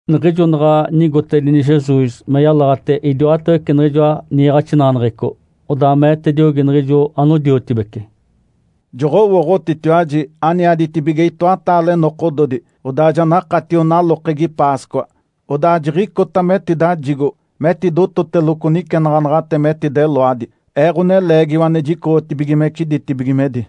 Niɡ̶ijo naɡ̶a nigotedini Jesus me yalaɡ̶ate idiwatawece niɡ̶ijoa niiɡ̶axinaɡ̶aneɡ̶eco, odaa meetediogi niɡ̶ijo anodiotibece, “Joɡ̶owooɡ̶otitiwaji aniaditibige itoataale nokododi, odaa ja nakatio nalokegi ‘Páscoa’. Odaa jiɡ̶icota metidajigo metidototeloco nicenaɡ̶anaɡ̶ate metideloadi, Ee, Ǥoneleegiwa ane jicoɡ̶otibigimece ditibigimedi.”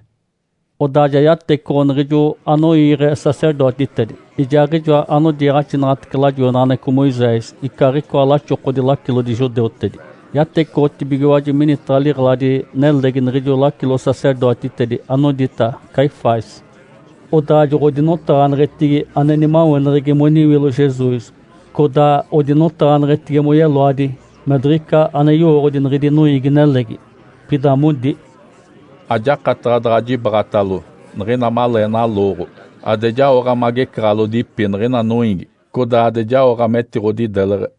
Odaa ja yatecoɡ̶o niɡ̶ijo anoiiɡ̶e sacerdotitedi, ijaaɡ̶ijo anodiiɡ̶axinaɡ̶atece lajoinaɡ̶aneɡ̶eco Moisés, icaaɡ̶icoa laxokodi lacilodi judeutedi. Yatecoɡ̶otibigiwaji minitaɡ̶a liɡ̶eladi-nelegi niɡ̶ijo lacilo-sacerdotitedi, anodita Caifás. Odaa joɡ̶odinotaɡ̶aneɡ̶etigi ane nimaweneɡ̶egi moniwilo Jesus codaa odinotaɡ̶aneɡ̶etigi moyeloadi me diɡ̶ica ane yowooɡ̶odi niɡ̶idi noiigi-nelegi. Pida modi, “Ajakataɡ̶a daɡ̶a jibaɡ̶atalo niɡ̶ina malee nalooɡ̶o ade jaoɡ̶a magecaɡ̶alodipi niɡ̶ina noiigi codaa ade jaoɡ̶a metiɡ̶odideleɡ̶e.”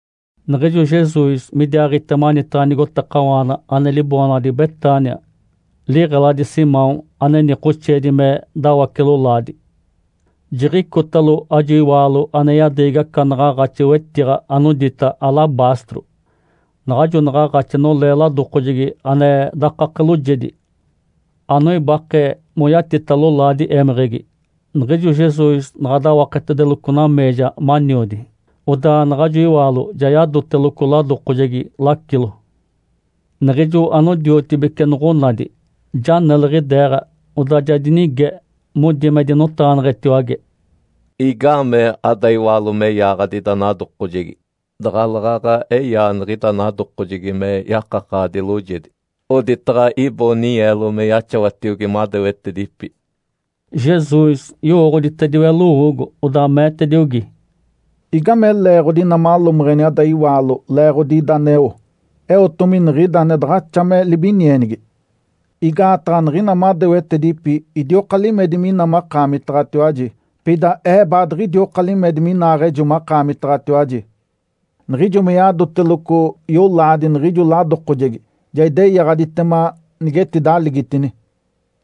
Niɡ̶ijo Jesus midiaaɡ̶ite manitaɡ̶a nigotakawaana ane liboonaɡ̶adi Betânia, liɡ̶eladi Simão ane nikoxeedi me “Dawace-lolaadi”, jiɡ̶icotalo ajo iwaalo ane yadeegi aca naɡ̶aaɡ̶axi, wetiɡ̶a anodita “alabastro”. Naɡ̶ajo naɡ̶aaɡ̶axi nolee ladokojegi ane dakake loojedi, anoibake moyatita lolaadi émeɡ̶egi. Niɡ̶ijo Jesus naɡ̶a dawaketedeloco nameeja maniodi, odaa naɡ̶ajo iwaalo ja yadotedeloco ladokojegi lacilo. Niɡ̶ijo anodiotibece noɡ̶onadi, ja neliɡ̶ideeɡ̶a, odaa ja dinige, modi me dinotaɡ̶aneɡ̶etiwage, “Igaamee ada iwaalo me yaaɡ̶adi ida nadokojegi? Daɡ̶aleeɡ̶aɡ̶a eyaa niɡ̶ida nadokojegi me yakakaɡ̶adi loojedi, oditaɡ̶a iboo ninyeelo me yaxawatiogi madewetedipi.” Jesus yowooɡ̶oditediwe lowoogo, odaa meetediogi, “Igame leeɡ̶odi ina malomeɡ̶eni ada iwaalo leeɡ̶odi ida aneo? Eotomi niɡ̶ida ane daɡ̶axa me libinienigi. Igaataɡ̶a niɡ̶ina madewetedipi idioka limedi mina makaamitaɡ̶atiwaji, pida Ee baadiɡ̶idioka limedi minaaɡ̶ejo makaamitaɡ̶atiwaji. Niɡ̶ijo me yadoteloco yolaadi niɡ̶ijo ladokojegi, ja ideyaɡ̶aditema nigetidaligitini.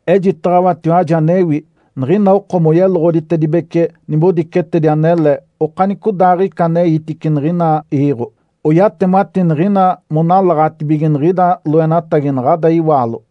Ejitaɡ̶awatiwaji anewi. Niɡ̶ina oko moyeloɡ̶oditedibece nibodicetedi anele okanicodaaɡ̶ica aneitice niɡ̶ina iiɡ̶o, oyatemati niɡ̶ina monalaɡ̶atibige niɡ̶ida loenatagi naɡ̶ada iwaalo.”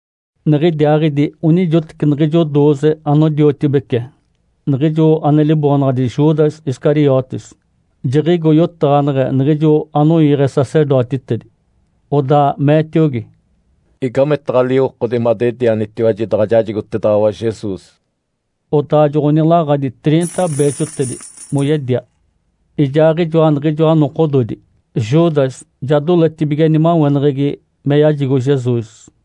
Niɡ̶idiaaɡ̶idi onijoteci niɡ̶ijo dooze anodiotibece, niɡ̶ijo ane liboonaɡ̶adi Judas Iscariotes, jiɡ̶igo yotaɡ̶aneɡ̶e niɡ̶ijo anoiiɡ̶e sacerdotitedi. Odaa meetiogi, “Igametaɡ̶a liwokodi madedianitiwaji, daɡ̶a jajigotedaɡ̶awa Jesus?” Odaa joɡ̶onilaɡ̶adi triinta beexotedi, moyedia. Ijaaɡ̶ijoa niɡ̶ijoa nokododi, Judas ja doletibige nimaweneɡ̶egi me yajigo Jesus.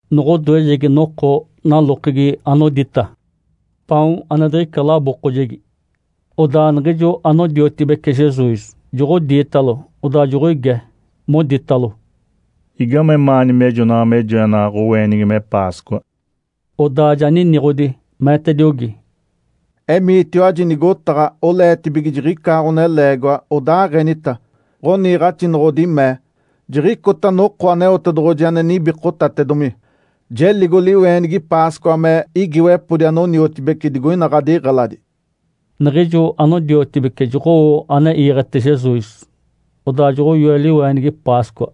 Noɡ̶odoejegi noko nalokegi anodita “Paon ane diɡ̶ica labookojegi”, odaa niɡ̶ijo anodiotibece Jesus joɡ̶odiitalo, odaa joɡ̶oige, moditalo, “Igamemaani mejonaɡ̶a me joenaɡ̶a ɡ̶oweenigi me Páscoa?” Odaa ja niniɡ̶odi, meetediogi, “Emiitiwaji nigotaɡ̶a, oleetibige jiɡ̶icaa ɡ̶oneleegiwa, odaaɡ̶enita, ‘Ǥoniiɡ̶axinoɡ̶odi mee, “Jiɡ̶icota noko Aneotedoɡ̶oji ane nibikotatedomi. Jeligo liweenigi Páscoa me igiiwepodi anoniotibici digoina ɡ̶adiɡ̶eladi.”’” Niɡ̶ijo anodiotibece joɡ̶owo ane iiɡ̶ete Jesus, odaa joɡ̶oyoe liweenigi Páscoa.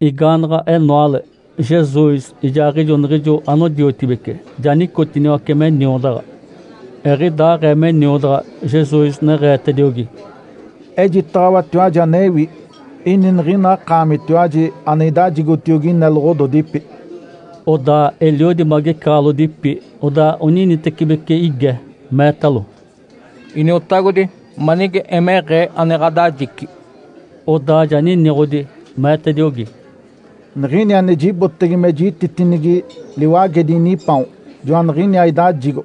Igaanaɡ̶a enoale, Jesus ijaaɡ̶ijo niɡ̶ijo anodiotibece ja nicotiniwace me niodaɡ̶a. Eɡ̶idaaɡ̶ee me niodaɡ̶a, Jesus neɡ̶eetediogi, “Ejitaɡ̶awatiwaji anewi. Ini niɡ̶ina akaamitiwaji ane idajigotiogi ineloɡ̶ododipi.” Odaa eliodi magecaɡ̶alodipi, odaa oninitecibeci ige, meetalo, “Iniotagodi, manige emeɡ̶ee ane ɡ̶adajici?” Odaa ja niniɡ̶odi, meetediogi, “Niɡ̶ini ane jibotege me jititinigi liwagedi inipaon, joaniɡ̶iniaa idajigo.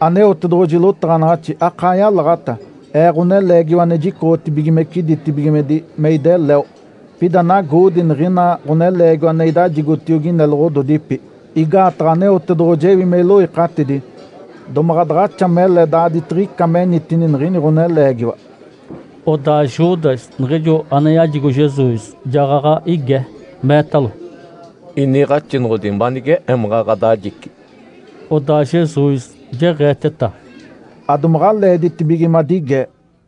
Aneotedoɡ̶oji lotaɡ̶anaɡ̶axi akaa yalaɡ̶ata Ee, Ǥoneleegiwa ane jicoɡ̶otibigimece ditibigimedi me ideleo. Pida nagoodi niɡ̶ina ɡ̶oneleegiwa ane idajigotiogi ineloɡ̶ododipi, igaataɡ̶a Aneotedoɡ̶oji ewi me iloikatidi. Domaɡ̶a daɡ̶axa mele daaditiɡ̶ica menitini niɡ̶ini ɡ̶oneleegiwa!” Odaa Judas, niɡ̶ijo ane yajigo Jesus, jaɡ̶aɡ̶a ige, meetalo, “Iniiɡ̶axinoɡ̶odi, manige emaɡ̶a ɡ̶adajici?” Odaa Jesus jeɡ̶eeteta, “Adomaɡ̶a leeditibige madigee!”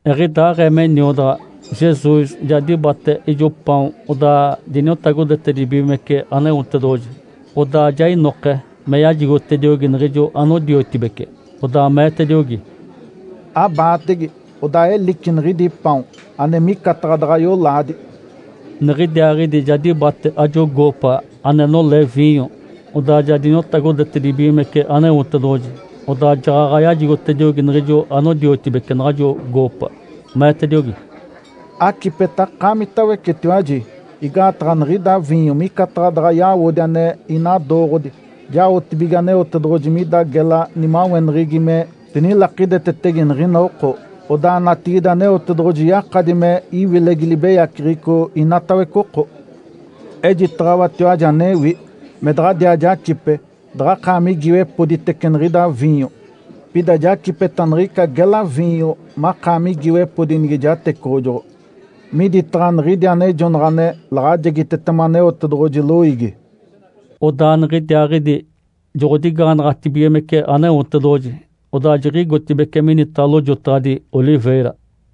Eɡ̶idaaɡ̶ee me niodaɡ̶a, Jesus ja dibate ijo paon, odaa diniotagodetedibigimece Aneotedoɡ̶oji. Odaa ja inoke me yajigotediogi niɡ̶ijo anodiotibece, odaa meetediogi, “Abaatege, odaa elici niɡ̶idi paon! Ane micataɡ̶a daɡ̶a yolaadi.” Niɡ̶idiaaɡ̶idi ja dibate ajo goopa ane nolee viinyo, odaa ja diniotagodetedibigimece Aneotedoɡ̶oji. Odaa jaɡ̶aɡ̶a yajigotediogi niɡ̶ijo anodiotibece naɡ̶ajo goopa, meetediogi, “Acipeta akaamitawecetiwaji! Igaataɡ̶a niɡ̶ida viinyo micataɡ̶a daɡ̶a yawodi ane inadooɡ̶odi, jaotibige Aneotedoɡ̶oji mida gela nimaweneɡ̶egi me dinilakidetetege niɡ̶ina oko. Odaa natigide Aneotedoɡ̶oji yakadi me iwilegi libeyaceɡ̶eco inatawece oko. Ejitaɡ̶awatiwaji anewi. Me daɡ̶adiaa jacipe daɡ̶akaami igiiwepoditece niɡ̶ida viinyo. Pida jacipeta niɡ̶ica gela viinyo makaami igiiwepodi nige jatecoɡ̶ojoɡ̶o miditaɡ̶a niɡ̶idi anejonaɡ̶a ane laɡ̶ajegitetema Aneotedoɡ̶oji loiigi.” Odaa niɡ̶idiaaɡ̶idi joɡ̶odigaanaɡ̶atibigimece Aneotedoɡ̶oji. Odaa jiɡ̶igotibeci minitaɡ̶a Lojotaɡ̶adi Oliveira.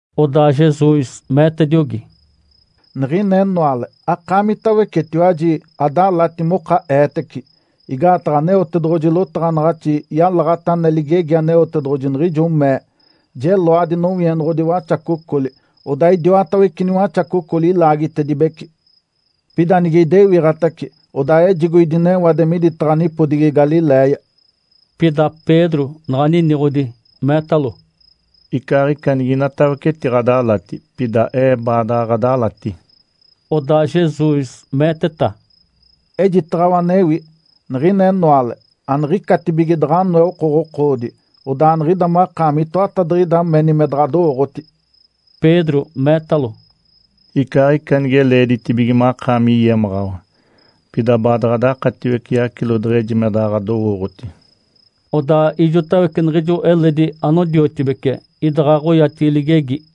Odaa Jesus meetediogi, “Niɡ̶ina enoale akaamitawecetiwaji adalati moka eetece, igaataɡ̶a Aneotedoɡ̶oji lotaɡ̶anaɡ̶axi yalaɡ̶ata ane ligegi Aneotedoɡ̶oji, niɡ̶ijo mee, ‘Jeloadi nowienoɡ̶odi waxacocoli, odaa idiwatawece niwaxacocoli ilaagitedibece.’ Pida nige idewiɡ̶atace, odaa ejigo idinewade miditaɡ̶a nipodigi Galiléia.” Pida Pedro naɡ̶a niniɡ̶odi, meetalo, “Icaaɡ̶ica niginatawece etiɡ̶adalati, pida ee baadaɡ̶a ɡ̶adalati.” Odaa Jesus meeteta, “Ejitaɡ̶awa anewi. Niɡ̶ina enoale, aniɡ̶icatibige daɡ̶a anoe okoɡ̶okoodi, odaa niɡ̶ida makaami itoatadiɡ̶ida meni me daɡ̶adowooɡ̶oti.” Pedro meetalo, “Icaaɡ̶ica nige leeditibige makaami yemaɡ̶awa, pida baadaɡ̶a adakatiwece yacilo deɡ̶eji me daɡ̶a ɡ̶adowooɡ̶oti.” Odaa ijotawece niɡ̶ijo eledi anodiotibece idaɡ̶aɡ̶a oyatigi ligegi.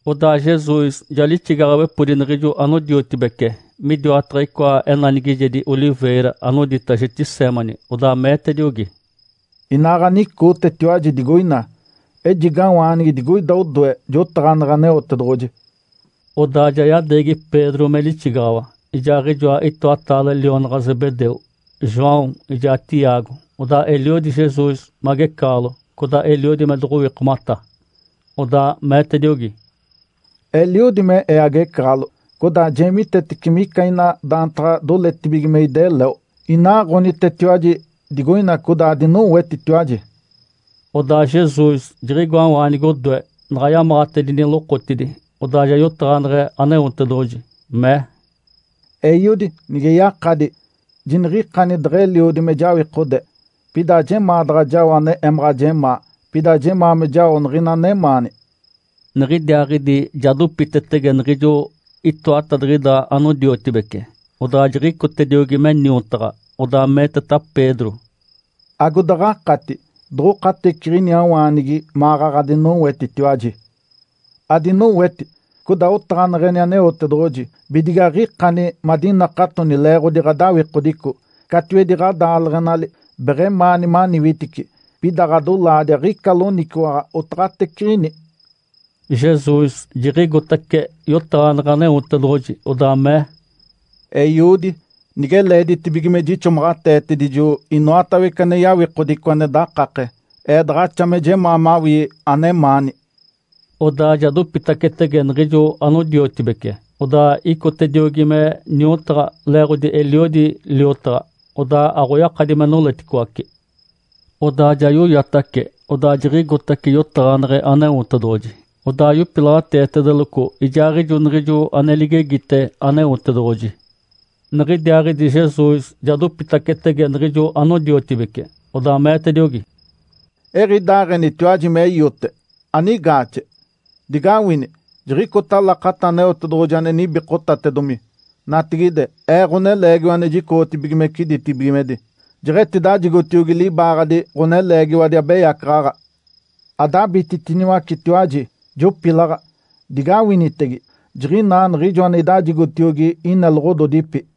Odaa Jesus ja lixigaɡ̶awepodi niɡ̶ijo anodiotibece midiwataɡ̶a icoa enanigijedi “oliveira” anodita Getsêmani. Odaa meetediogi, “Inaaɡ̶anicootetiwaji digoina. Ejigawaanigi digoida odoe jotaɡ̶aneɡ̶e Aneotedoɡ̶oji.” Odaa ja yadeegi Pedro me lixigaɡ̶awa ijaaɡ̶ijoa itoataale lionaɡ̶a Zebedeu, João ijaa Tiago. Odaa eliodi Jesus magecaɡ̶alo, codaa eliodi me doɡ̶owikomata. Odaa meetediogi, “Eliodi me Ee agecaɡ̶alo codaa jeemitetece mica ina daantaɡ̶a doletibige me ideleo. Inaaɡ̶onitetiwaji digoina codaa adinowetitiwaji.” Odaa Jesus jiɡ̶igoawaanigi odoe, naɡ̶a yamaɡ̶atedini lokotidi, odaa ja yotaɡ̶aneɡ̶e Aneotedoɡ̶oji, mee, “Eiodi, nige yakadi, jiniɡ̶ikani deɡ̶eliodi me jawikode. Pida ajemaa daɡ̶a jao ane emaɡ̶a jemaa, pida jemaa me jao niɡ̶ina anemaani.” Niɡ̶idiaaɡ̶idi ja dopitetege niɡ̶ijo itoatadiɡ̶ida anodiotibece, odaa jiɡ̶icotediogi me niotaɡ̶a. Odaa meeteta Pedro, “Agodaɡ̶akati doɡ̶okateciɡ̶iniawaanigi maɡ̶aɡ̶a adinowetitiwaji? Adinoweti, codaa otaɡ̶aneɡ̶eni Aneotedoɡ̶oji, bidige aɡ̶ikani madinakatoni leeɡ̶odi ɡ̶adawikodico. Catiwedi ɡ̶adaaleɡ̶enali beɡ̶emaani maniwitici, pida ɡ̶adolaadi aɡ̶ica loniciwaɡ̶a otaɡ̶ateciɡ̶ini.” Jesus jiɡ̶igotace yotaɡ̶aneɡ̶e Aneotedoɡ̶oji, odaa mee, “Eiodi, nige leeditibige me jixomaɡ̶ateetedijo inoatawece ane yawikodico ane dakake, Ee daɡ̶axa me jemaa mawii anemaani.” Odaa ja dopitacetege niɡ̶ijo anodiotibece, odaa icotacediogi me niotaɡ̶a, leeɡ̶odi eliodi liotaɡ̶a, odaa aɡ̶oyakadi me noleticoace. Odaa ja yoyatace, odaa jiɡ̶igotace yotaɡ̶aneɡ̶e Aneotedoɡ̶oji, odaa yopilaɡ̶ateetedeloco ijaaɡ̶ijo niɡ̶ijo ane ligegite Aneotedoɡ̶oji. Niɡ̶idiaaɡ̶idi Jesus ja dopitacetege niɡ̶ijo anodiotibece, odaa meetediogi, “Eɡ̶idaaɡ̶enitiwaji me iote, anigaaxe? Digawini! Jiɡ̶icota lakata Aneotedoɡ̶oji ane nibikotatedomi. Natigide, Ee, Ǥoneleegiwa ane jicoɡ̶otibigimece ditibigimedi, jeɡ̶etidajigotiogi libaaɡ̶adi ɡ̶oneleegiwadi abeyacaɡ̶aɡ̶a. Adabititiniwacetiwaji, jopilaɡ̶a! Digawinitege! Jiɡ̶inaa niɡ̶ijo ane idajigotiogi ineloɡ̶ododipi.”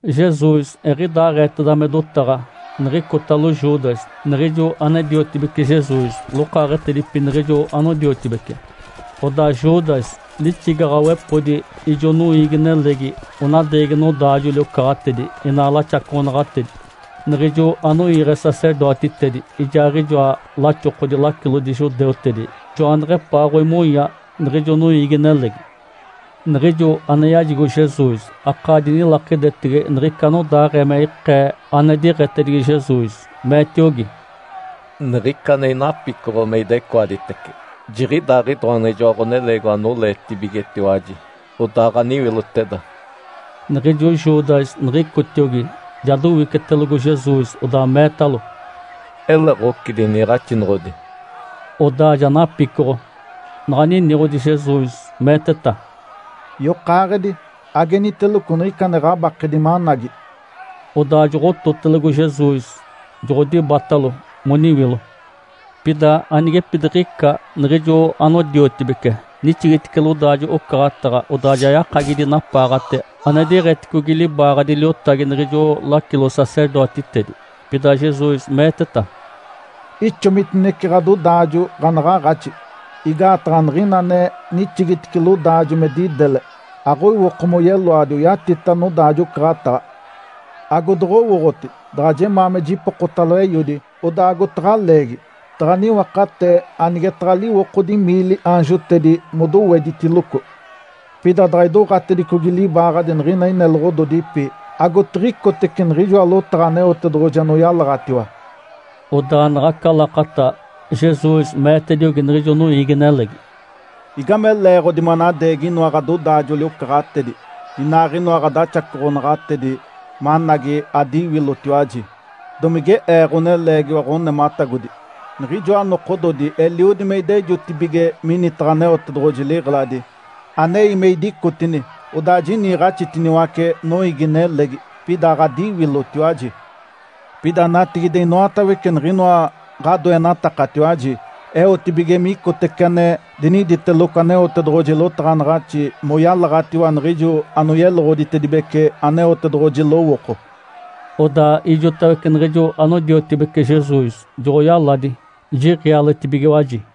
Jesus eɡ̶idaaɡ̶eeteda me dotaɡ̶a niɡ̶icotalo Judas, niɡ̶ijo ane-diotibece Jesus, lokaaɡ̶etedipi niɡ̶ijo anodiotibece. Odaa Judas lixigaɡ̶awepodi ijo noiigi-nelegi onadeegi nodaajoli-ocaɡ̶atedi inaa laxacoɡ̶onaɡ̶atedi. Niɡ̶ijo anoiiɡ̶e sacerdotitedi ijaaɡ̶ijoa laxokodi lacilodi judeutedi joaneɡ̶epaaɡ̶oimonya niɡ̶ijo noiigi-nelegi. Niɡ̶ijo ane yajigo Jesus akaa dinilakidetege niɡ̶ica anodaaɡ̶ee me ikee ane diɡ̶etedigi Jesus. Meetiogi, “Niɡ̶ica ane inapicoɡ̶o me idecoaditece, jiɡ̶idaaɡ̶idoa niɡ̶ijoa ɡ̶oneleegiwa anoleetibigetiwaji. Odaaɡ̶aniwiloteda!” Niɡ̶ijo Judas niɡ̶icotiogi, ja dowicetelogo Jesus, odaa meetalo, “Ele ɡ̶ocidi, iniiɡ̶axinoɡ̶odi?” Odaa ja napicoɡ̶o. Naɡ̶a niniɡ̶odi Jesus, meeteta, “Yokaaɡ̶edi, ageniteloco niɡ̶ica ane ɡ̶abakedi managi!” Odaa joɡ̶ototelogo Jesus, joɡ̶odibatalo moniwilo. Pida anigepidiɡ̶ica niɡ̶ijo anodiotibece nixigitice lodaajo-ocaɡ̶ataɡ̶a, odaa ja yakagidi napaaɡ̶ate ane diɡ̶eticogi libaaɡ̶adi liotagi niɡ̶ijo lacilo-sacerdotitedi. Pida Jesus meeteta, “Ixomitinece ɡ̶adodaajo ɡ̶anaɡ̶aaɡ̶axi. Igaataɡ̶a niɡ̶ina ane nixigitice lodaajo me didele, aɡ̶oiwoko moyeloadi oyatita nodaajo-ocaɡ̶ataɡ̶a. Agodoɡ̶owooɡ̶oti daɡ̶a jemaa me jipokotalo Eiodi, odaa agotaɡ̶a leegi, taɡ̶a niwakatee anigetaɡ̶a liwokodi miili aanjotedi modoweditiloco? Pida daɡ̶a idoɡ̶atedicogi libaaɡ̶adi niɡ̶ina ineloɡ̶ododipi, agotiɡ̶icotece niɡ̶ijoa lotaɡ̶a Aneotedoɡ̶oji anoyalaɡ̶atiwa.” Odaa naɡ̶aca lakata, Jesus meetediogi niɡ̶ijo noiigi-nelegi, “Igame leeɡ̶odi manadeegi inoa ɡ̶adodaajoli-ocaɡ̶atedi inaaɡ̶inoa ɡ̶adaxacoɡ̶onaɡ̶atedi managi adiwilotiwaji? Domige Ee ɡ̶oneleegiwa ɡ̶onematagodi? Niɡ̶ijoa nokododi eliodi me idejotibige minitaɡ̶a Aneotedoɡ̶oji liɡ̶eladi, anei me idicotini odaa jiniiɡ̶axitiniwace noiigi-nelegi, pida aɡ̶adiwilotiwaji. Pida natigide inoatawece niɡ̶inoa ɡ̶adoenatakatiwaji eotibige micotece ane diniditeloco Aneotedoɡ̶oji lotaɡ̶anaɡ̶axi moyalaɡ̶atiwa niɡ̶ijo anoyeloɡ̶oditedibece Aneotedoɡ̶oji lowooko.” Odaa ijotawece niɡ̶ijo anodiotibece Jesus joɡ̶oyaladi, jiɡ̶ialetibigiwaji.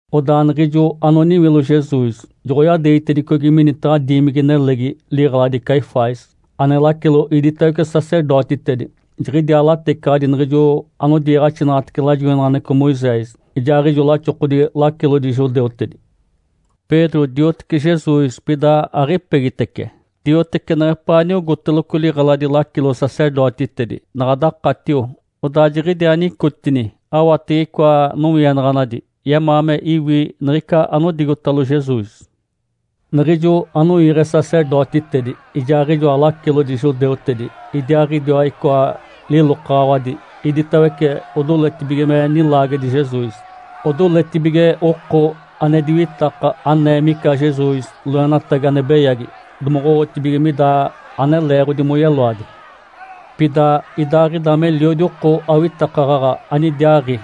Odaa niɡ̶ijo anoniwilo Jesus joɡ̶oyadeegitedicogi minitaɡ̶a diimigi-nelegi liɡ̶eladi Caifás, ane lacilo idiwatawece sacerdotitedi. Jiɡ̶idiaa latecaɡ̶adi niɡ̶ijo anodiiɡ̶axinaɡ̶atece lajoinaɡ̶aneɡ̶eco Moisés, ijaaɡ̶ijoa laxokodi lacilodi judeutedi. Pedro diotece Jesus, pida aɡ̶ipegitece. Diotece neɡ̶epaa niogóteloco liɡ̶eladi lacilo-sacerdotitedi. Naɡ̶a dakatio, odaa jiɡ̶idiaa nicotini awatege icoa nowienaɡ̶anadi, yemaa me iwi niɡ̶ica anodigotalo Jesus. Niɡ̶ijo anoiiɡ̶e sacerdotitedi ijaaɡ̶ijoa lacilodi judeutedi idiaaɡ̶idiwa icoa lilokaɡ̶awadi iditawece odoletibige me nilaagedi Jesus. Odoletibige oko ane diwitaka anee mica Jesus loenatagi ane beyagi, domoɡ̶owotibige mida ane leeɡ̶odi moyeloadi. Pida idaaɡ̶ida meliodi oko awitakaɡ̶aɡ̶a anidiaaɡ̶i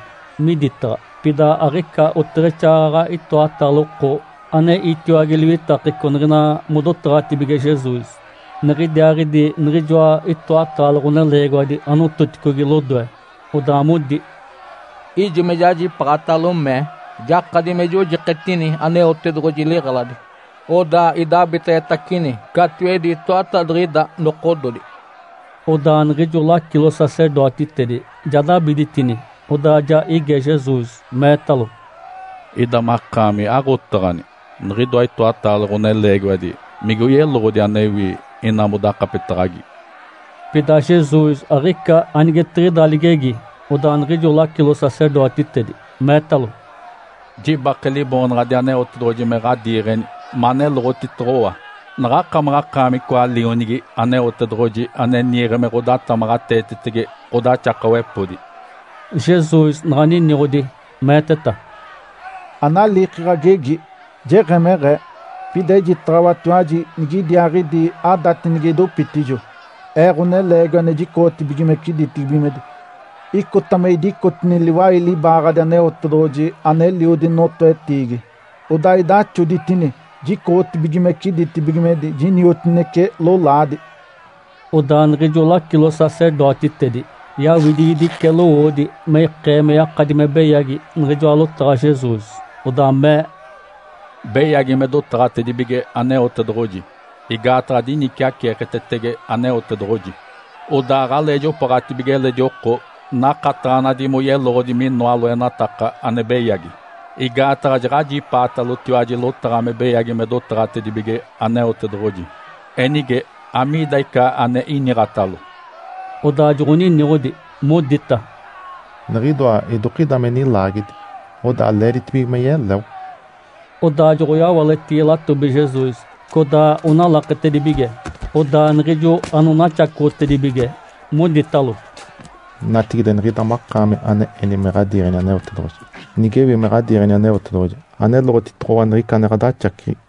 miditaɡ̶a, pida aɡ̶ica oteɡ̶exaaɡ̶aɡ̶a itoataale oko ane itiwage liwitakeco niɡ̶ina modotaɡ̶atibige Jesus. Niɡ̶idiaaɡ̶idi jiɡ̶ijoa itoataale ɡ̶oneleegiwadi anototicogi lodoe. Odaa modi, “Ijo me jajipaaɡ̶atalo mee, ‘Jakadi me jojiketini Aneotedoɡ̶oji liɡ̶eladi, odaa idabiteɡ̶etacini catiwedi itoatadiɡ̶ida nokododi.’” Odaa niɡ̶ijo lacilo-sacerdotitedi ja dabiditini, odaa ja ige Jesus, meetalo, “Ida makaami aɡ̶otaɡ̶ani? Niɡ̶idoa itoataale ɡ̶oneleegiwadi migoyeloɡ̶odi anewi ina modakapetaɡ̶agi?” Pida Jesus aɡ̶ica anigetiɡ̶ida ligegi. Odaa niɡ̶ijo lacilo-sacerdotitedi meetalo, “Jibake Liboonaɡ̶adi Aneotedoɡ̶oji me ɡ̶adiiɡ̶eni me aneloɡ̶otitoɡ̶owa! Naɡ̶akamaɡ̶akaami icoa Lionigi Aneotedoɡ̶oji, ane niiɡ̶e me ɡ̶odatamaɡ̶ateetetege ɡ̶odaxakawepodi?” Jesus naɡ̶a niniɡ̶odi, meeteta, “Analiiki ɡ̶agegi, jeɡ̶emeɡ̶ee. Pida ejitaɡ̶awatiwaji nigidiaaɡ̶idi adati nige idopitijo, Ee, Ǥoneleegiwa ane jicoɡ̶otibigimece ditibigimedi. Icota me idicotini liwai libaaɡ̶adi Aneotedoɡ̶oji aneliodi notoetiigi, odaa idaxoditini jicoɡ̶otibigimece ditibigimedi, jiniotinece lolaadi.” Odaa niɡ̶ijo lacilo-sacerdotitedi yaawidigidice lowoodi me ikee me yakadi me beyagi niɡ̶ijoa lotaɡ̶a Jesus. Odaa mee, “Beyagi me dotaɡ̶atedibige Aneotedoɡ̶oji, igaataɡ̶a diniciaceeketetege Aneotedoɡ̶oji. Odaa aɡ̶alee jopooɡ̶atibige eledi oko nakataɡ̶anadi moyeloɡ̶odi minoa loenataka ane beyagi. Igaataɡ̶a jaɡ̶ajipaatalotiwaji lotaɡ̶a me beyagi me dotaɡ̶atedibige Aneotedoɡ̶oji. Enige, amiida ica ane iniɡ̶atalo?” Odaa joɡ̶oniniɡ̶odi, modita, “Niɡ̶idoa idokida me nilaagedi, odaa leeditibige me yeleo.” Odaa joɡ̶oyawaletigi latobi Jesus, codaa onalaketedibige. Odaa niɡ̶ijo anonaxacoɡ̶otedibige moditalo, “Natigide, niɡ̶ida makaami ane eni me ɡ̶adiiɡ̶eni Aneotedoɡ̶oji. Nigewi me ɡ̶adiiɡ̶eni Aneotedoɡ̶oji, aneloɡ̶otitoɡ̶owa niɡ̶ica ane ɡ̶adaxaciɡ̶i!”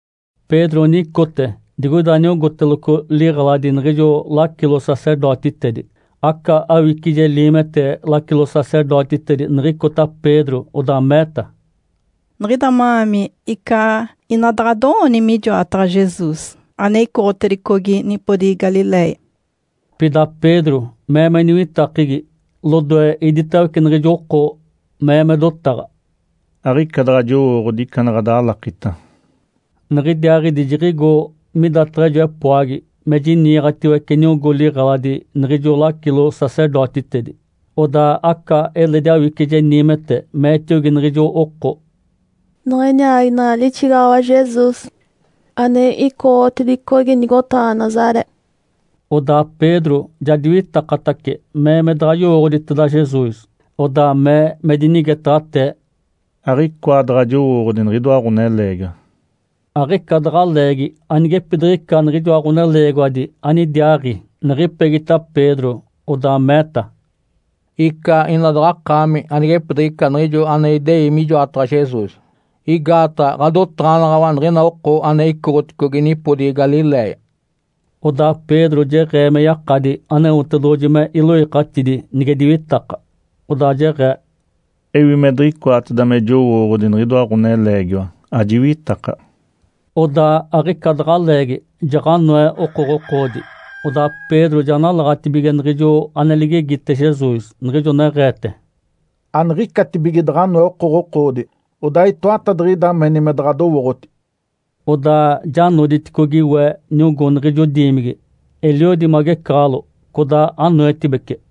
Pedro nicote digoida niogóteloco liɡ̶eladi niɡ̶ijo lacilo-sacerdotitedi. Aca awicije liimete lacilo-sacerdotitedi niɡ̶icota Pedro, odaa meeta, “Niɡ̶ida ma-aami icaa ina daɡ̶a ado-ooni mijoataɡ̶a Jesus ane icoɡ̶otedicogi nipodigi Galiléia.” Pida Pedro mee me niwitakegi lodoe iditawece niɡ̶ijo oko, mee me dotaɡ̶a, “Aɡ̶ica daɡ̶a jowooɡ̶odi ica ane ɡ̶adalakita.” Niɡ̶idiaaɡ̶idi jiɡ̶igo midataɡ̶a ijo epoagi me jiniiɡ̶atiwece niogó liɡ̶eladi niɡ̶ijo lacilo-sacerdotitedi. Odaa aca eledi awicije niimete meetiogi niɡ̶ijo oko, “Niɡ̶ini aaginaɡ̶a lixigaɡ̶awa Jesus ane icoɡ̶otedicogi nigotaɡ̶a Nazaré.” Odaa Pedro ja diwitakatace mee me daɡ̶a yowooɡ̶oditeda Jesus, odaa mee me dinigetaɡ̶atee, “Aɡ̶icoa daɡ̶a jowooɡ̶odi niɡ̶idoa ɡ̶oneleegiwa!” Aɡ̶ica daɡ̶a leegi anigepidiɡ̶ica niɡ̶ijoa ɡ̶oneleegiwadi anidiaaɡ̶i, niɡ̶ipegita Pedro, odaa meeta, “Icaa ina daɡ̶akaami anigepidiɡ̶ica niɡ̶ijo ane idei mijoataɡ̶a Jesus, igaataɡ̶a ɡ̶adotaɡ̶anaɡ̶awa niɡ̶ina oko ane icoɡ̶oticogi nipodigi Galiléia.” Odaa Pedro jeɡ̶ee me yakadi Aneotedoɡ̶oji me iloikatidi nige diwitaka, odaa jeɡ̶ee, “Ewi me diɡ̶icoateda me jowooɡ̶odi niɡ̶idoa ɡ̶oneleegiwa, ajiwitaka!” Odaa aɡ̶ica daɡ̶a leegi, jaɡ̶anoe okoɡ̶okoodi. Odaa Pedro ja nalaɡ̶atibige niɡ̶ijo ane ligegite Jesus, niɡ̶ijo neɡ̶eete, “Aniɡ̶icatibige daɡ̶a anoe okoɡ̶okoodi, odaa itoatadiɡ̶ida meni me daɡ̶a adowooɡ̶oti.” Odaa ja noditicogi we niogó niɡ̶ijo diimigi, eliodi magecaɡ̶alo, codaa anoetibece.